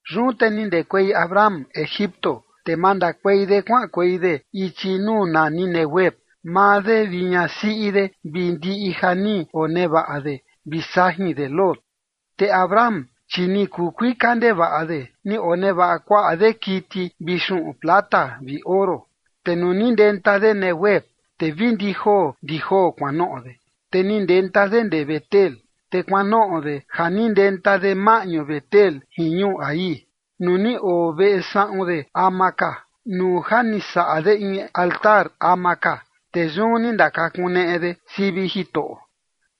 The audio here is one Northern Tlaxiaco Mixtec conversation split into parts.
Yun te ni ndekuei Abram Egipto, te mandakuei de kuaꞌankuei de ichi nuu nani Neguev, maa de vi ñasiꞌi de vi ndiꞌi ja ni onevaꞌa de vi sajin de Lot. Te Abram, chi ni kuu kuika ndevaꞌa de ni onevaꞌa kuaꞌa de kiti vi xuꞌun plata vi oro. Te nuu ni ndenta de Neguev, te vi ndi joo ndi joo kuanoꞌo de, te ni ndenta de ndee Betel, te kuanoꞌo de ja ni ndenta de maꞌñu Betel jin ñuu Hai, nuu ni oo veꞌe saꞌun de ama ka, nuu ja ni saꞌa de in altar ama ka, te yun ni ndakakuneꞌe de sivi Jitoꞌo.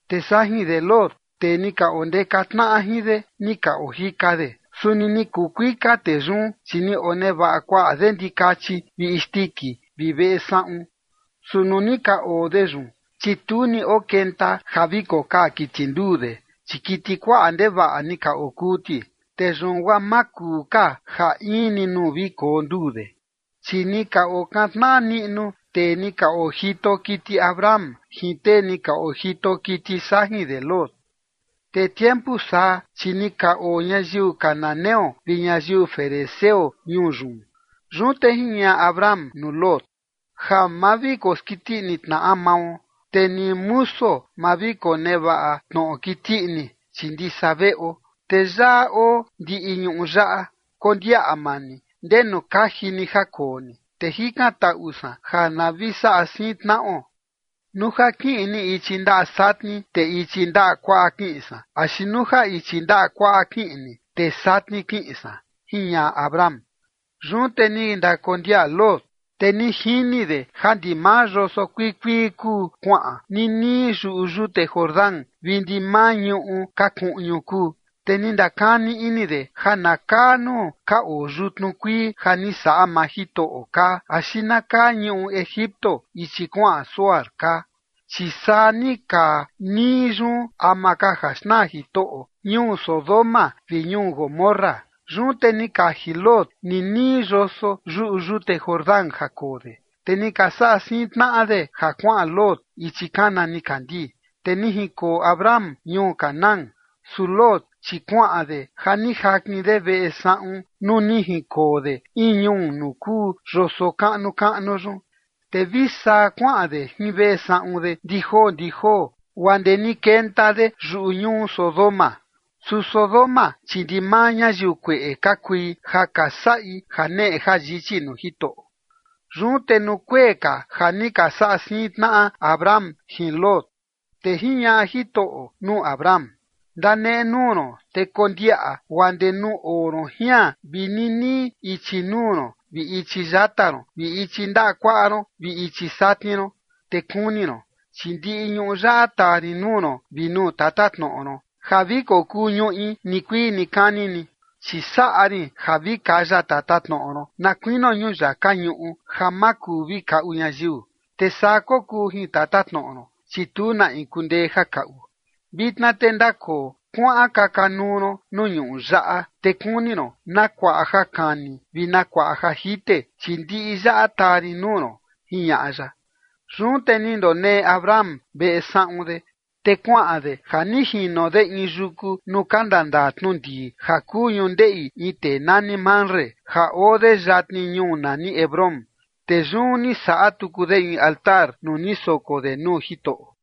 Te sajin de Lot tee ni ka ondeka tnaꞌa jin de ni ka ojika de, suni ni kuu kuika tee yun, chi ni onevaꞌa kuaꞌa de ndikachi vi isndiki vi veꞌe saꞌun. Su nuu ni ka oo de yun, chi tu ni okenta ja vi kokaa kiti nduu de, chi kiti kuaꞌa ndevaꞌa ni ka okuu ti, te yun guaa ma kuu ka ja in ni nuu vi koo nduu de. Chi ni ka okantnaꞌa niꞌnu tee ni ka ojito kiti Abram jin tee ni ka ojito kiti sajin de Lot. Te tiempu saa, chi ni ka oo ñayiu cananeo vi ñayiu ferezeo ñuu yun. Yun te jiñaꞌa Abram nuu Lot: ―Ja ma vi koskiti ini tnaꞌa mao, te ni musuo ma vi konevaꞌa tnoꞌo kiti ini, chi ndisa veꞌo, te yaꞌa oo ndiꞌi ñuꞌu yaꞌa, kondiaꞌa maa ni ndenu kaji ni ja koo ni, te jikantaꞌu san ja na vi saꞌa siin tnaꞌo. Nuu ja kiꞌin ni ichi ndaꞌa satni, te ichi ndaꞌa kuaꞌa kiꞌin san, axi nuu ja ichi ndaꞌa kuaꞌa kiꞌin ni, te satni kiꞌin san ―jiñaꞌa Abram. Yun te ni ndakondiaꞌa Lot, te ni jini de ja ndimaa yoso kuii kuii kuu kuaꞌan nii nii yuꞌu yute Jordán vi ndimaa ñuꞌu ka kuꞌñu kuu, te ni ndakani ini de ja na kaa nuu ka oo yutnu kuii ja ni saꞌa maa Jitoꞌo kaa axi na kaa ñuꞌu Egipto ichi kuaꞌan Zoar kaa, chi saa ni kaa nii yun ama ka ja xnaa Jitoꞌo ñuu Sodoma vi ñuu Gomorra. Yun te ni kaji Lot nii nii yoso yuꞌu yute Jordán ja koo de, te ni ka saꞌa siin tnaꞌa de ja kuaꞌan Lot ichi kana nikandii. Te ni jinkoo Abram ñuu Canaán. Su Lot, chi kuaꞌan de ja ni jakin de veꞌe saꞌun nuu ni jinkoo de in ñuu nuu kuu yoso kaꞌnu kaꞌnu yun, te vi saa kuaꞌan de jin veꞌe saꞌun de ndi joo ndi joo guaa ndee ni kenta de yuꞌu ñuu Sodoma. Su Sodoma chi ndimaa ñayiu kueꞌe ka kui ja ka saꞌi janeꞌe jayichi nuu Jitoꞌo. Yun te nuu kuee ka ja ni ka saꞌa siin tnaꞌa Abram jin Lot, te jiñaꞌa Jitoꞌo nuu Abram: ―Ndanenuu ron te kondiaꞌa guaa ndee nuu oo ron jian vi ninii ichi nuu ron vi ichi yata ron vi ichi ndaꞌa kuaꞌa ron vi ichi satni ron. Te kuni ron, chi ndiꞌi ñuꞌu yaꞌa taa rin nuu ron vi nuu tatatnoꞌo ron ja vi kokuu ñuꞌi nikuii nikani ni. Chi saꞌa rin ja vi kaya tatatnoꞌo ron na kuinio ñuyaka ñuꞌu ja ma kuu vi kaꞌu ñayiu, te saa kokuu jin tatatnoꞌo ron, chi tu na in kundee ja kaꞌu. Vitna te ndakoo kuaꞌan kaka nuu ron nuu ñuꞌu yaꞌa, te kuni ron na kuaꞌa ja kani vi na kuaꞌa ja jite, chi ndiꞌi yaꞌa taa rin nuu ron ―jiñaꞌa ya. Yun te ni ndoneꞌe Abram veꞌe saꞌun de, te kuaꞌan de ja ni jino de in yuku nuu ka ndandaa tnu ndii ja kuu ñundeꞌi in tee nani Mamre ja oo de yatni ñuu nani Hebrón, te yun ni saꞌa tuku de in altar nuu ni soko de nuu Jitoꞌo.